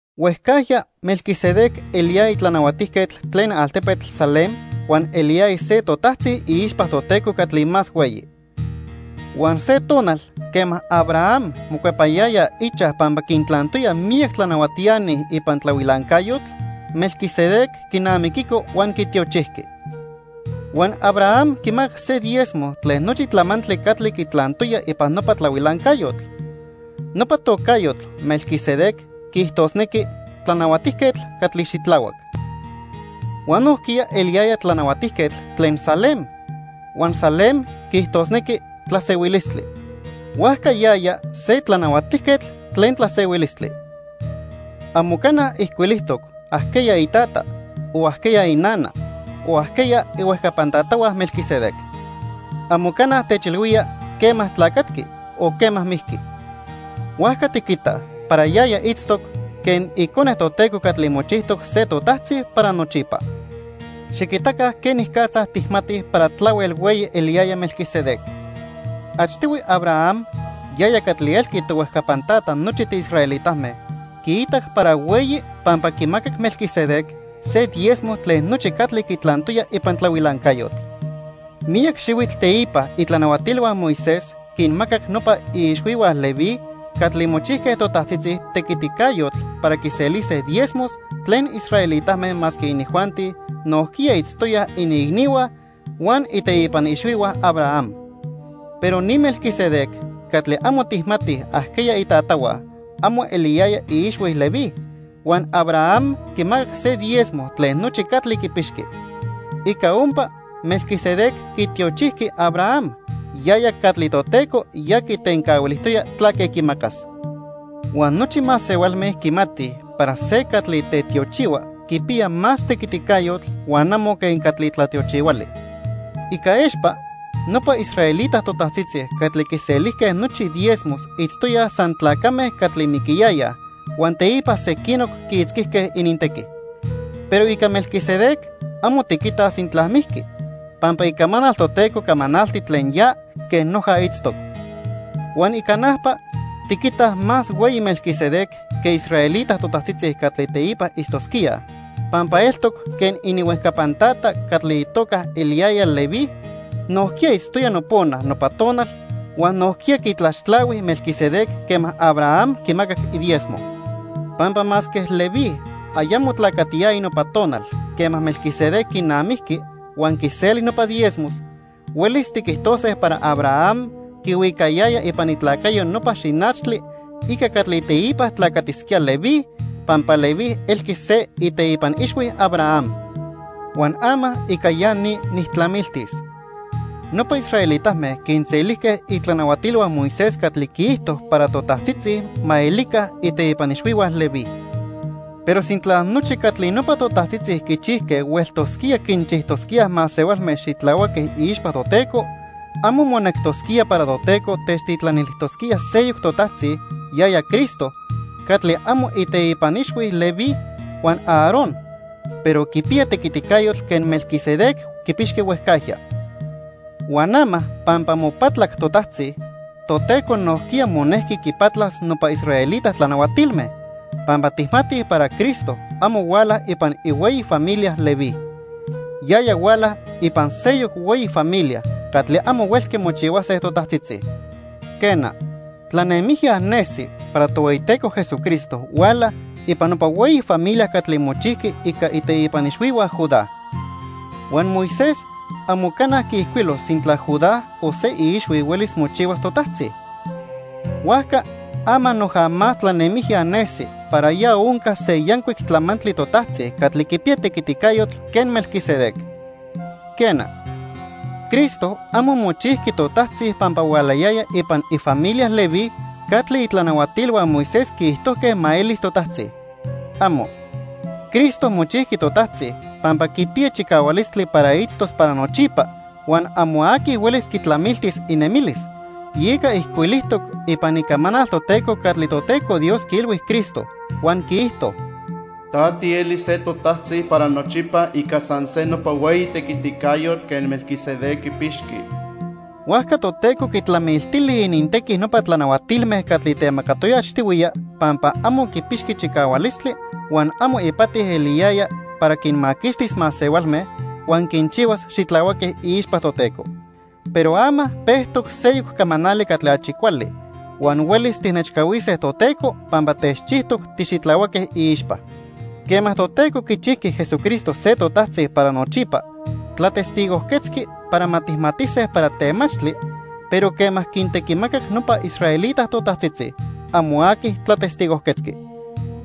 Huejcajya Melquisedec eliyaya tlanahuatijquetl tlen altepetl Salem huan eliyaya se totajtzi iixpa Toteco Catli Más Hueyi. Huan se tonal quema Abraham mocuepayaya ichaj pampa quintlantoya miyac tlanahuatiani ipan tlahuilancayotl, Melquisedec quinamiquico huan quitiochijqui. Huan Abraham quimacac se diezmo tlen nochi tlamantli catli quitlantoya ipan nopa tlahuilancayotl. Nopa tocayotl, Melquisedec, quiijtosnequi "Tlanahuatijquetl Catli Xitlahuac." Huan nojquiya eliyaya tlanahuatijquetl tlen Salem, huan Salem quiijtosnequi "Tlasehuilistli." Huajca yaya se "Tlanahuatijquetl Tlen Tlasehuilistli." Amo cana ijcuilijtoc ajqueya itata, o ajqueya inana, o ajqueya ihuejcapan tatahua Melquisedec. Amo cana techilhuía quema tlacatqui o quema mijqui. Huajca tiquitaj para yaya itztoc quen Icone Toteco catli mochijtoc se totajtzi para nochipa. Xiquitaca quenicatza tijmatij para tlahuel hueyi eliyaya Melquisedec. Achtihui Abraham, yaya catli elqui tohuejcapan tata nochi tiisraelitame, quiitac para hueyi pampa quimacac Melquisedec se diezmo tlen nochi catli quitlantoya ipan tlahuilancayotl. Miyac xihuitl teipa itlanahuatilhua Moisés quinmacac nopa iixhuihua Leví catli mochijque totajtzitzi tequiticayotl para quiselise diezmos tlen israelitame masque inijuanti nojquiya itztoyaj iniicnihua huan iteipan ixhuihua Abraham. Pero ni Melquisedec catli amo tijmatij ajqueya itatahua amo eliyaya iixhui Leví, huan Abraham quimacac se diezmo tlen nochi catli quipixqui. Ica ompa, Melquisedec quitiochijqui Abraham, yaya catli Toteco ya quitencahuilijtoya tlaque quimacas. Huan nochi masehualme quimatij para se catli tetiochihua quipiya más tequiticayotl huan amo quen catli tlatiochihuali. Ica expa, nopa israelita totajtzitzi catli quiselijque nochi diezmos itztoyaj san tlacame catli miquiyayaj huan teipa sequinoc quiitzquijque inintequi. Pero ica Melquisedec amo tiquitaj sintla mijqui, pampa Icamanal Toteco camanalti tlen ya quen noja itztoc. Huan ica najpa, tiquitaj más hueyi Melquisedec que israelita totajtzitzi catli teipa itztosquíaj pampa eltoc quen ininhuejcapan tata catli itoca eliyaya Leví, nojquiya itztoya nopona nopa tonal huan nojquiya quitlaxtlahui Melquisedec quema Abraham quimacac idiezmo. Pampa masque Leví ayamo tlacatiyaya nopa tonal quema Melquisedec quinamijqui huan quiseli nopa diezmos, huelis tiquijtose para Abraham quihuicayaya ipan itlacayo nopa xinachtli ica catli teipa tlacatisquía Leví, pampa Leví elqui se iteipan ixhui Abraham. Huan ama ica ya ni nijtlamiltis. Nopa israelitame quinselijque itlanahuatilhua Moisés catli quiijto para totajtzitzi ma elica iteipan ixhuihua Leví. Pero sintla nochi catli nopa totajtzitzi quichijque hueltosquía quinchijtosquíaj masehualme xitlahuaque iixpa Toteco, amo monectosquía para Toteco techtitlanilijtosquía seyoc totajtzi, yaya Cristo, catli amo ininteipan ixhui Leví huan Aarón, pero quipiya tequiticayotl quen Melquisedec quipixqui huejcajya. Huan ama pampa mopatlac totajtzi, Toteco nojquiya monejqui quipatlas nopa israelita tlanahuatilme, pampa tijmatij para Cristo amo huala ipan ihueyi familia Leví. Yaya huala ipan seyoc hueyi familia catli amo huelqui mochihuase totajtzitzi. Quena, tlanemijya nesi para Tohueyiteco Jesucristo huala ipan nopa hueyi familia catli mochijqui ica iteipan ixhuihua Judá. Huan Moisés amo cana quiijcuilo sintla Judá o se iixhui huelis mochihuas totajtzi. Huajca ama noja más tlanemijya nesi para ya onca se yancuic tlamantli totajtzi catli quipiya tequiticayotl quen Melquisedec. Quena, Cristo amo mochijqui totajtzi pampa hualayaya ipan ifamilia Leví catli itlanahuatilhua Moisés quiijtojque ma elis totajtzi. ¡Amo! Cristo mochijqui totajtzi pampa quipiya chicahualistli para itztos para nochipa huan amo aqui huelis quitlamiltis inemilis, yeca ijcuilijtoc ipan Icamanal Toteco catli Toteco Dios quiilhui Cristo, huan quiijto: "Ta tielis se titotajtzi para nochipa ica san se nopa hueyi tequiticayotl quen Melquisedec quipixqui." Huajca Toteco quitlamiltili inintequi nopa tlanahuatilme catli temacatoya achtihuiya pampa amo quipixqui chicahualistli, huan amo ipati eliyaya para quinmaquixtis masehualme huan quinchihuas xitlahuaque iixpa Toteco. Pero ama pejtoc seyoc camanali catli achi cuali huan huelis tijnechcahuise Toteco pampa techchijtoc tixitlahuaque iixpa. Quema Toteco quichijqui Jesucristo se totajtzi para nochipa, tlatestigojquetzqui para ma tijmatise para temachtli, pero quema quintequimacac nopa israelita totajtzitzi, amo aqui tlatestigojquetzqui.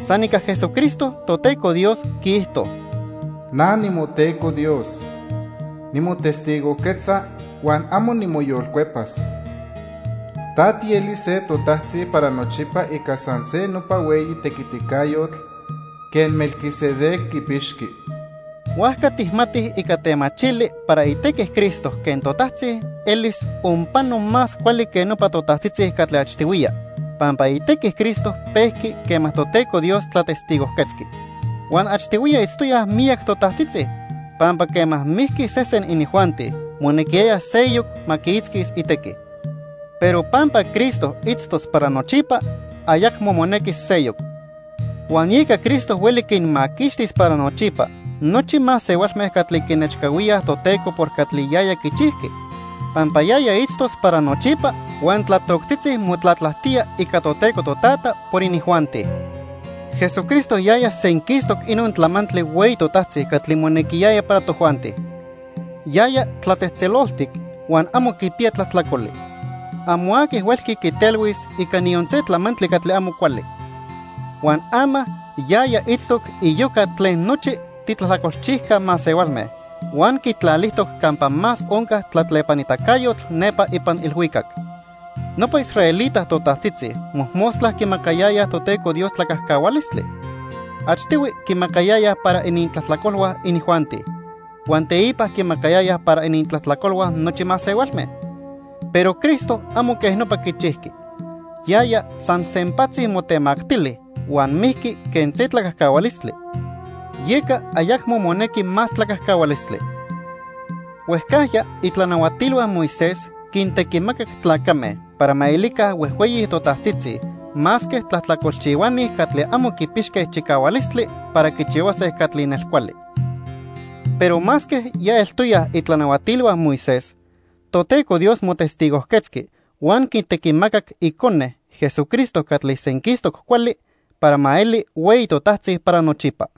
San ica Jesucristo Toteco Dios quiijto: "Na nimoTeco Dios. Nimotestigojquetza huan amo nimoyolcuepas: 'Ta tielis se totajtzi para nochipa ica san se nopa hueyi tequiticayotl quen Melquisedec quipixqui.' " Huajca tijmatij ica temachili para itequi Cristo quen totajtzi elis onpano más cuali que nopa totajtzitzi catli achtihuiya, pampa itequi Cristo pejqui quema Toteco Dios tlatestigojquetzqui. Huan achtihuiya itztoyaj miyac totajtzitzi, pampa quema mijqui sesen inijuanti, monequiyaya seyoc ma quiitzquis itequi. Pero pampa Cristo itztos para nochipa, ayacmo monequis seyoc. Huan yeca Cristo hueli quinmaquixtis para nochipa nochi masehualme catli quinechcahuíaj Toteco por catli yaya quichijqui, pampa yaya itztos para nochipa huan tlatoctzitzi motlatlajtía ica Toteco Totata por inijuanti. Jesucristo yaya senquistoc inon tlamantli hueyi totajtzi catli monequiyaya para tojuanti. Yaya tlatzejtzeloltic huan amo quipiya tlajtlacoli. Amo aqui huelqui quitelhuis ica niyon se tlamantli catli amo cuali. Huan ama yaya itztoc iyoca tlen nochi titlajtlacolchijca masehualme, huan quitlalijtoc campa más onca tlatlepanitacayotl nepa ipan ilhuicac. Nopa israelita totajtzitzi mojmostla quimacayayaj Toteco Dios tlacajcahualistli. Achtihui quimacayayaj para inintlajtlacolhua inijuanti, huan teipa quimacayayaj para inintlajtlacolhua nochi masehualme. Pero Cristo amo quej nopa quichijqui. Yaya san sempatzi motemactili huan mijqui quen se tlacajcahualistli, yeca ayacmo monequi más tlacajcahualistli. Huejcajya itlanahuatilhua Moisés quintequimacac tlacame para ma elica huejhueyi totajtzitzi masque tlajtlacolchihuani catli amo quipixque chicahualistli para quichihuase catli nelcuali. Pero masque ya eltoyaj itlanahuatilhua Moisés, Toteco Dios motestigojquetzqui huan quitequimacac Icone, Jesucristo catli senquistoc cuali, para ma eli hueyi totajtzi para nochipa.